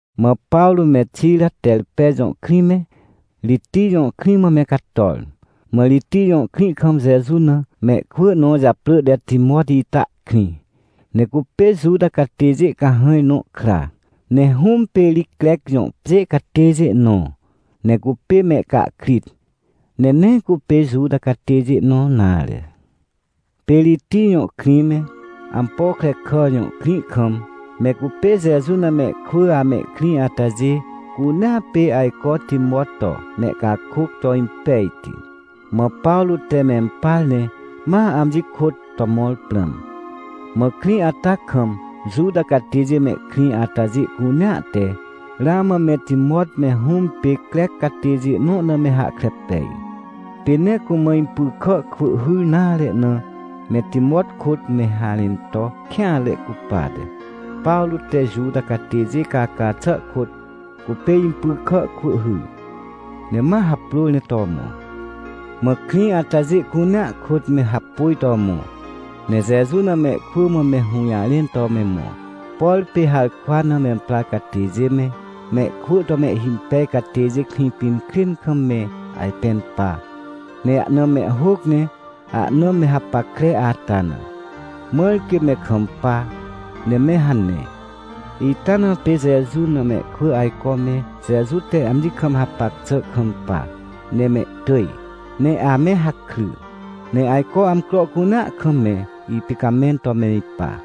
Mã Pawrô me Xira Terpe jõ krĩ me, Ritij jõ krĩ mã me cator. Mã Ritij jõ krĩ kam Jeju na mehkwỳ nõ japrỳ te Timot ita ihkrĩ. Ne cupê Juta catêjê cahãj nõ kra, ne hũm pê ri Crec jõ pjê catêjê nõ, ne cupê mehcahkrit, ne nee cupê Juta catêjê nõ nare. Pê Ritij jõ krĩ me, Ampokrekà jõ krĩ kam me cupê Jeju na mehkwỳ amehkrĩ atajê cunea pê ajco Timot to mehcakôc to impejti. Mã Pawrô te mempar ne ma amji kôt to mõr prãm. Mã krĩ ata kam Juta catêjê mehkrĩ atajê cunea te ramã meTimot me hũm pê Crec catêjê nõ na me hahkre pej. Pê nee cumã impy kà kwỳ hyr nare na me Timot kôt me harẽn to kêanre cupate, Pawrô te Juta catêjê caca xà kôt, cupê impy kà kwỳ hyr, ne ma haprôr ne to mõ. Mã krĩ atajê cunea kôt me hapôj to mõ, ne Jeju na mehkwỳ mã me hũjarẽn to me mõ, por pê harkwa na memprar catêjê me, mehkwỳ to mehhimpej catêjê Krĩpinkrên kam me ajpẽn pa, ne ahna mehhôc ne ahna me hapackre ata na, mãr quê me kampa, ne me hane. Ita na pê Jeju na mehkwỳ ajco me Jeju te amji kam hapac xà kampa ne mehtỳj, ne ame hakry. Ne ajco amcro cunea kam me ipicamẽn to me ipa.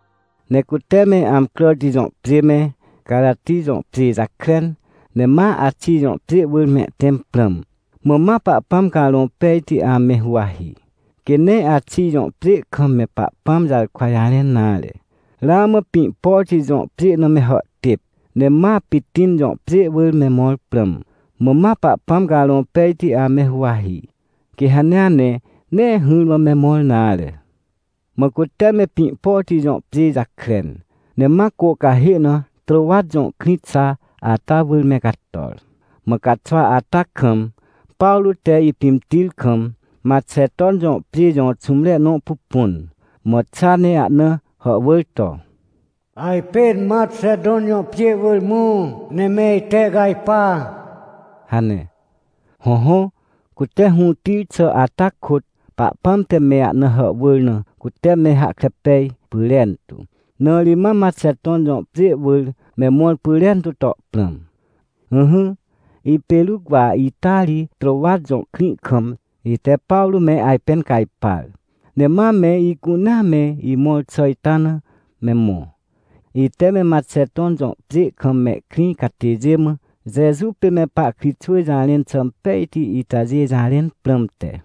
Ne cute me Amcràti jõ pjê me, Carati jõ pjê jakren, ne ma Axij jõ pjê wỳr mehtẽm prãm, mã ma Pahpãm Carõ Pejti ame huwahi, quê nee Axij jõ pjê kam me Pahpãm jarkwa jarẽn nare. Ramã Pĩhpoti jõ pjê na me hàhtêp, ne ma Pitin jõ pjê wỳr me mõr prãm, mã ma Pahpãm Carõ Pejti ame huwahi, quê hanea ne nee hỹrmã me mõr nare. Mã cute me Pĩhpoti jõ pjê jakren, ne ma cô cahê na Trôwat jõ krĩ xa ata wỳr me cator. Mã caxwa ata kam, Pawrô te ipimtir kam, Maxeton jõ pjê jõ xũmre nõ pupun, mã xa ne ahna hàhwỳr to: — Ajpên Maxeton jõ pjê wỳr mõ, ne me itehcajpa — hane. Hõhõ, cute hũtir xà ata kôt Pahpãm te me ahna hàhwỳr na cute me hahkre pej pyrentu, na ri ma Maxeton jõ pjê wỳr me mõr pyrentu to prãm. Ỹhỹ, ipê Ruc wa ita ri Trôwat jõ krĩ kam ite Pawrô me ajpẽn cajpar, ne ma me icunea me imõr xà ita na me mõ, ite me Maxeton jõ pjê kam mehkrĩ catêjê mã Jeju pê me pahkritxwỳ jarẽn xà impejti itajê jarẽn prãmte.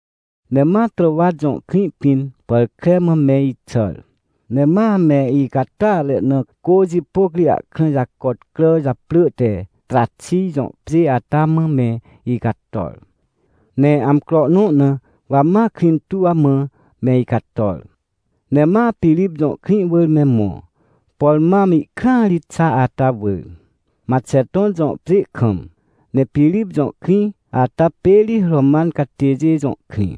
Ne ma Trôwat jõ krĩ pĩn pàr kre mã me ixàr, ne ma me icatàatre na cô jipôc ri ahkrã jacot crà japrỳ te Traxij jõ pjê ata mã me icator. Ne amcro nõ na wa maKrĩhtuw mã me icator. Ne ma Pirip jõ krĩ wỳr me mõ, por mam ihkrãa ri xa ata wỳr, Maxeton jõ pjê kam, ne Pirip jõ krĩ ata pê ri Roman catêjê jõ krĩ.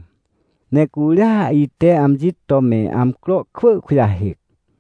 Ne curia ite amji to me amcro kwỳ kujahêc.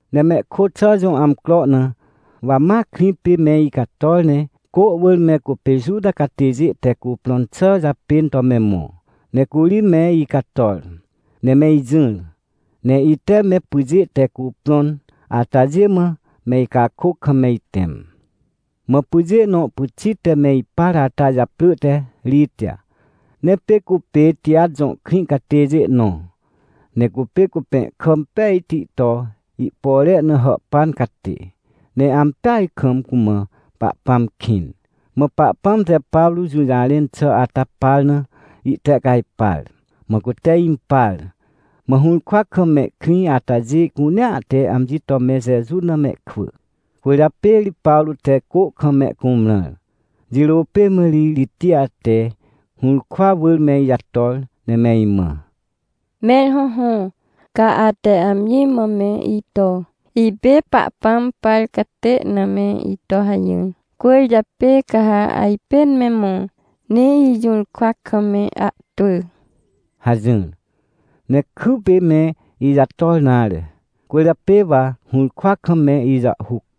Ne mehkôt xà jõ amcro na, wa ma krĩ pê me icator ne cô wỳr me cupê Juta catêjê te cuprõn xà japên to me mõ. Ne curi me icator, ne me ijỹr, ne ite me pyjê te cuprõn atajê mã me icakôc kam me itẽm. Mã pyjê nõ pyxit te me ipar ata japrỳ te Ritij. Ne pê cupê Tijat jõ krĩ catêjê nõ, ne cupê cupẽhkà impejti to ihpore na hàhpan catê. Ne ampeaj kam cumã Pahpãm kĩn, mã Pahpãm te Pawrô jũjarẽn xà ata par na ihtehcajpar. Mã cute impar, mã hũrkwa kam mehkrĩ atajê cunea te amji to me Jeju na mehkwỳ. Cwỳrjapê ri Pawrô te cô kam mehcumrãr. Jirô pê mã ri Ritij te hũrkwa wỳr me ijator, ne me imã: — Mẽr hõhõ, ca ate amji mã me ito, ipê Pahpãm par catê na me ito hajỹr, cwỳrjapê ca ha ajpên me mõ, ne ijũrkwa kam me ahtwỳ — hajỹr. Ne kypê me ijator nare. Cwỳrjapê wa hũrkwa kam me ijàhhuc.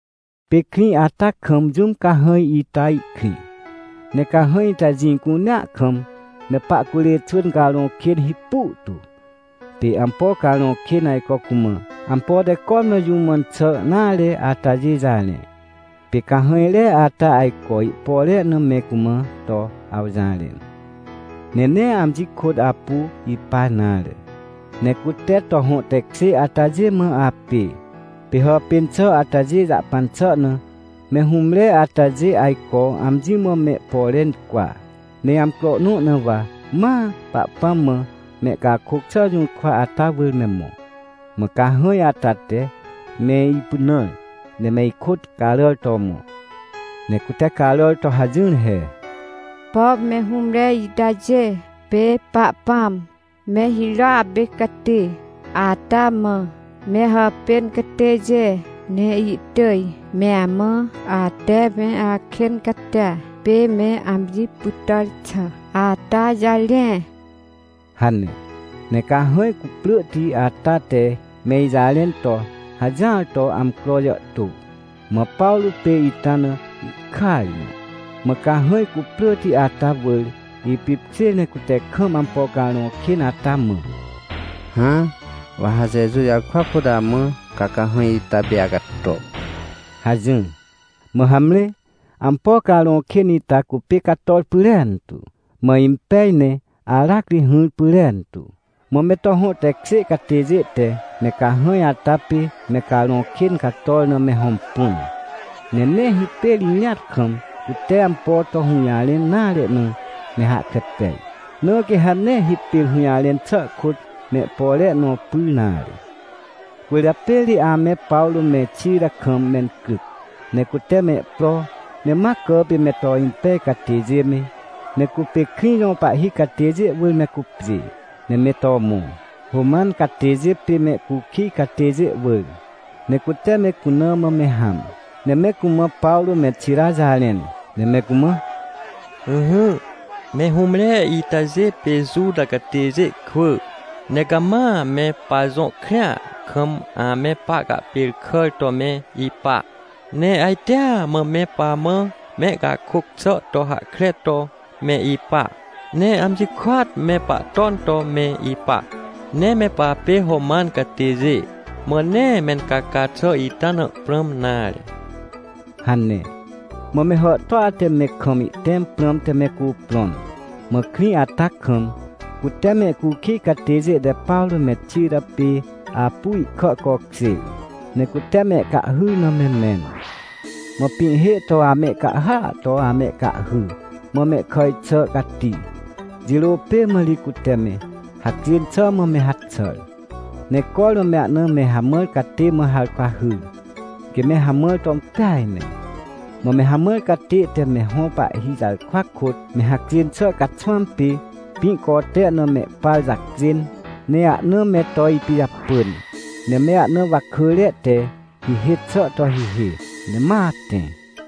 Pê krĩ ata kam jũm cahãj ita ihkrĩ. Ne cahãj ita jĩ cunea kam me pahcurê xwỳn carõ kên hipu tu. Pê ampo carõ kên ajco cumã ampo te cormã jũ mãn xà nare atajê jarẽ. Pê cahãjre ata ajco ihpore na me cumã to awjarẽ. Ne nee amji kôt apu ipa nare. Ne cute to hõ tekjê atajê mã apê, pê hàpên xà atajê jahpan xà na, me hũmre atajê ajco amji mã mehpore incwa. Ne amcro nõ na wa ma Pahpãm mã mehcakôc xà jũrkwa ata wỳr me mõ. Mã cahãj ata te me ipynãr ne me ikôt caràr to mõ. Ne cute caràr to hajỹr he: — Pom me hũmre itajê pê Pahpãm me hirôa pê cati ata mã me hàpên catêjê! Ne ihtỳj me amã ate me akên catia pê me amji pytàr xà ata jarẽ — hane. Ne cahãj cuprỳhti ata te me ijarẽn to hajỹar to amcro jàhtô. Mã Pawrô pê ita na ihkaj na. Mã cahãj cuprỳhti ata wỳr ipipkjêr ne cute kam ampo carõ kên ata mã: — Hã, wa ha Jeju jarkwa kôt amã, ca cahãj ita pê acato — hajỹr. Mã hamre, ampo carõ kên ita cupê cator pyrentu. Mã impej ne aracri hỹr pyrentu. Mã me to hõ tekjê catêjê te me cahãj ata pê me carõ kên cator na me hõmpun, ne nee hipêr irĩat kam, cute ampo to hũjarẽn nare na me hahkre pej, na quê ha nee hipêr hũjarẽn xà kôt mehpore nõ pyr nare. Cwỳrjapê ri ame Pawrô me Xira kam mencryc. Ne cute mehpro, ne ma cà pê me to impej catêjê me, me cupê krĩ jõ pahhi catêjê wỳr me cupjê. Ne me to mõ, Roman catêjê pê mehcukij catêjê wỳr, ne cute me cuna mã me hãm. Ne me cumã Pawrô me Xira jarẽn, ne me cumã: — Ỹhỹ, me hũmre itajê pê Juta catêjê kwỳ, ne cama me pajõ krĩa kam ame pahcahpêrkàr to me ipa. Ne ajtea mã me pamã mehcakôc xà to hahkre to me ipa, ne amji kôat me pahton to me ipa. Ne me papê Roman catêjê, mã nee mencaca xà ita na prãm nare — hane. Mã me hàhtôa te me kam ihtẽm prãmte me cuprõn, mã krĩ ata kam, cute mehcukij catêjê te Pawrô me Xira pê apu ihkà cokjêr, ne cute mehcahhyr na me mẽn. Mã pĩhhê to amehcahhya to amehcahhy, mã mehkàj xà cati. Jirô pê mã ri cute me hacjên xà mã me haxàr, ne cormã me ahna me hamãr catê mã harkwa hyr, quê me hamãr to impeaj ne. Mã me hamãr catê te me hõ pahhi jarkwa kôt me hacjên xà caxwãm pê, pĩ cote na mehpar jacjên, ne ahna me to ipijapỳn, ne me ahna wakỳre te hihê xà to hihê, ne ma tẽ.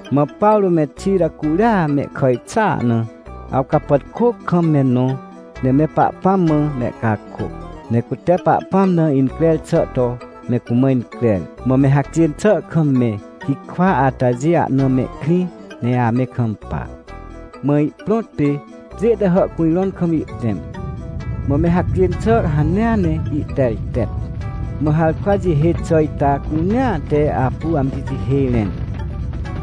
Mã Pawrô me Xira curia mehkàj xàa na, awcapàtkô kam me nõ ne me Pahpãm mã mehcakôc, ne cute Pahpãm na increr xà to me cumã increr. Mã me hacjên xà kam me hikwa atajê ahna mehkrĩ ne ame kampa. Mã ihprõt pê, pjê te hàhcujrõn kam ihtẽm, mã me hacjên xà hanea ne ihtertet. Mã harkwa jihê xà ita cunea te apu amji jihê rẽn.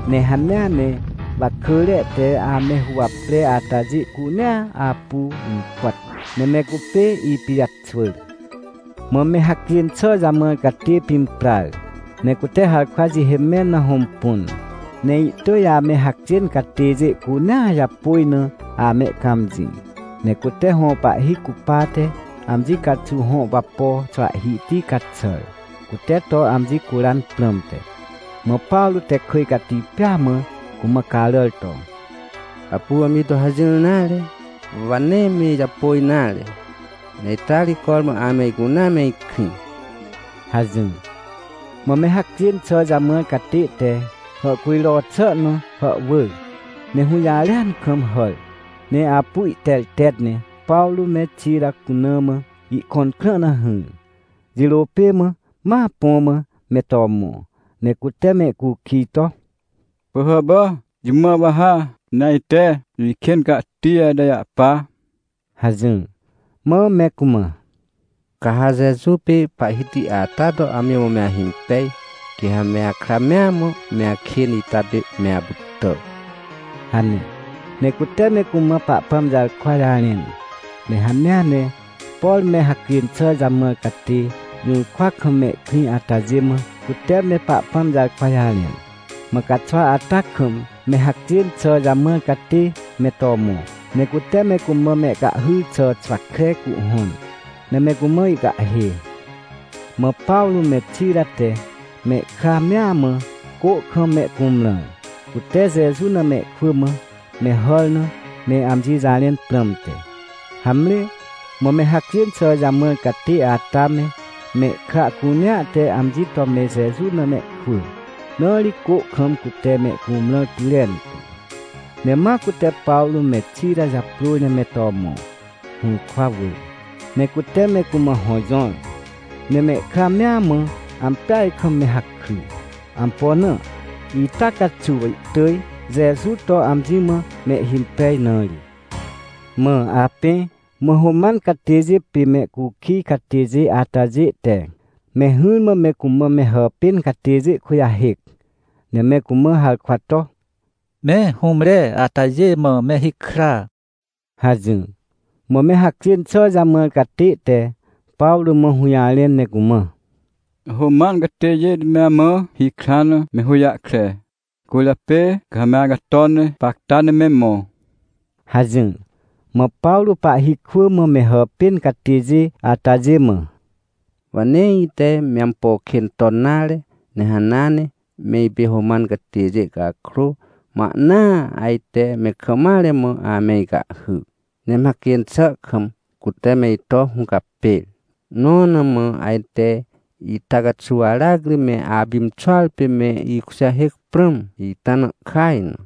Ne hanea ne wakỳre te ame huwapre atajê cunea apu impàt, ne me cupê ipijaxwỳr. Mã me hacjên xà jamãr catê pimprar, ne cute harkwa jihê mẽn na hõmpun. Ne ihtỳj ame hacjên catêjê cunea japôj na amehcãmjĩ. Ne cute hõ pahhi cupate amji caxuw hõ wapo xwahhihti caxàr, cute to amji curan prãmte. Mã Pawrô te kỳj cati pêa mã cumã caràr to: — Apu amji to hajỹr nare! Wa nee me ijapôj nare! Ne ita ri cormã ame icunea me ikrĩ! — hajỹr. Mã me hacjên xà jamãr catê te hàhcujro xà na hàhwỳr ne hũjarêan kam hàr, ne apu ihtertet ne Pawrô me Xira cuna mã ihkõn krã na hỹr. Jirô pê mã, ma põ mã me to mõ, ne cute mehcukij to: — Pỳhàpà, jũ mã wa ha, ne ajte ikên catia ita jahpa? — hajỹr. Mã me cumã: — Ca ha Jeju pê Pahhiti ata to amji mã me ahimpej, quê ha me akra mea mã me akên ita pê me apytà — hane. Ne cute me cumã Pahpãm jarkwa jarẽn, ne hanea ne, por me hacjên xà jamãr catê jũrkwa kam mehkrĩ atajê mã, cute me Pahpãm jarkwa jarẽn. Mã caxwa ata kam me hacjên xà jamãr catê me to mõ, ne cute me cumã mehcahhyr xà xwa kre cuhhõn, ne me cumã ihcahhê. Mã Pawrô me Xira te mehkra mea mã cô kam mehcumrãr, cute Jeju na mehkwỳ mã me hàr na me amji jarẽn prãmte. Hamre, mã me hacjên xà jamãr catê ata me, mehkra cunea te amji to me Jeju na mehkwỳ, na ri cô kam cute mehcumrãr pyrentu. Ne ma cute Pawrô me Xira japrôr ne me to mõ, hũrkwa wỳr. Ne cute me cumã hõ jõr, ne mehkra mea mã ampeaj kam me hakry. Ampo na? Ita caxuw ihtỳj Jeju to amji mã mehhimpej na ri. Mã apẽ, mã Roman catêjê pê mehcukij catêjê atajê te me hỹrmã me cumã me hàpên catêjê kujahêc, ne me cumã harkwa to: — Me hũmre atajê mã me hikra — hajỹr. Mã me hacjên xà jamãr catê te Pawrô mã hũjarẽn ne cumã: — Roman catêjê te me amã hikran na me hũjahkre. Cwỳrjapê ca ha me acato ne gapacta ne me mõ — hajỹr. Mã Pawrô pahhi kwỳ mã me hàpên catêjê atajê mã: — Wa nee ite me ampo kên ton nare, ne hanea ne, me ipê Roman catêjê cakrô, mã ahnaa ajte me kam mare mã ame icahhy, ne me hacjên xà kam cute me ito hũcapêr, nõ na mã ajte ita caxuw aracri me apimxuar pê me ikujahêc prãm? Ita na ihkaj na.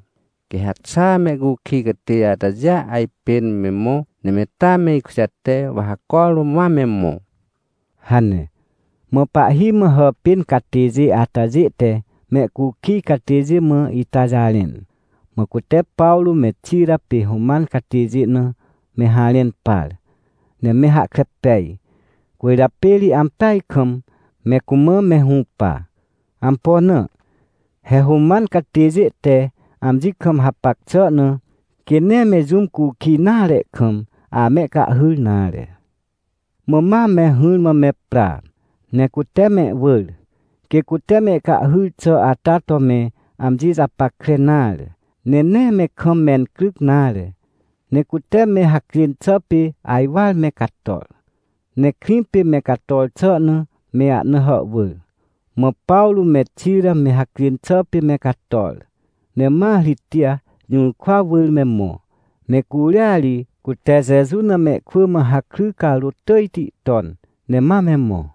Quê ha xaa mehcukij catêjê atajêa ajpên me mõ, ne me taa me ikujate, wa ha cormã ma me mõ — hane. Mã pahhi mã hàpên catêjê atajê te mehcukij catêjê mã ita jarẽn. Mã cute Pawrô me Xira pê Roman catêjê na me harẽn par, ne me hahkre pej, cwỳrjapê ri ampeaj kam me cumã me hũpa. Ampo na? He Roman catêjê te amji kam hapac xà na, quê nee me jũm cukij nare kam, amehcahhyr nare. Mã ma me hỹrmã me pra, ne cute mehwỳr, quê cute mehcahhyr xà ata to me amji japackre nare, ne nee me kam mencryc nare. Ne cute me hacjên xà pê ajwar me cator. Ne krĩ pê me cator xà na me ahna hàhwỳr. Mã Pawrô me Xira me hacjên xà pê me cator, ne ma Ritij jũrkwa wỳr me mõ. Ne curia ri cute Jeju na mehkwỳ mã hakry carôt tỳjti ton, ne ma me mõ.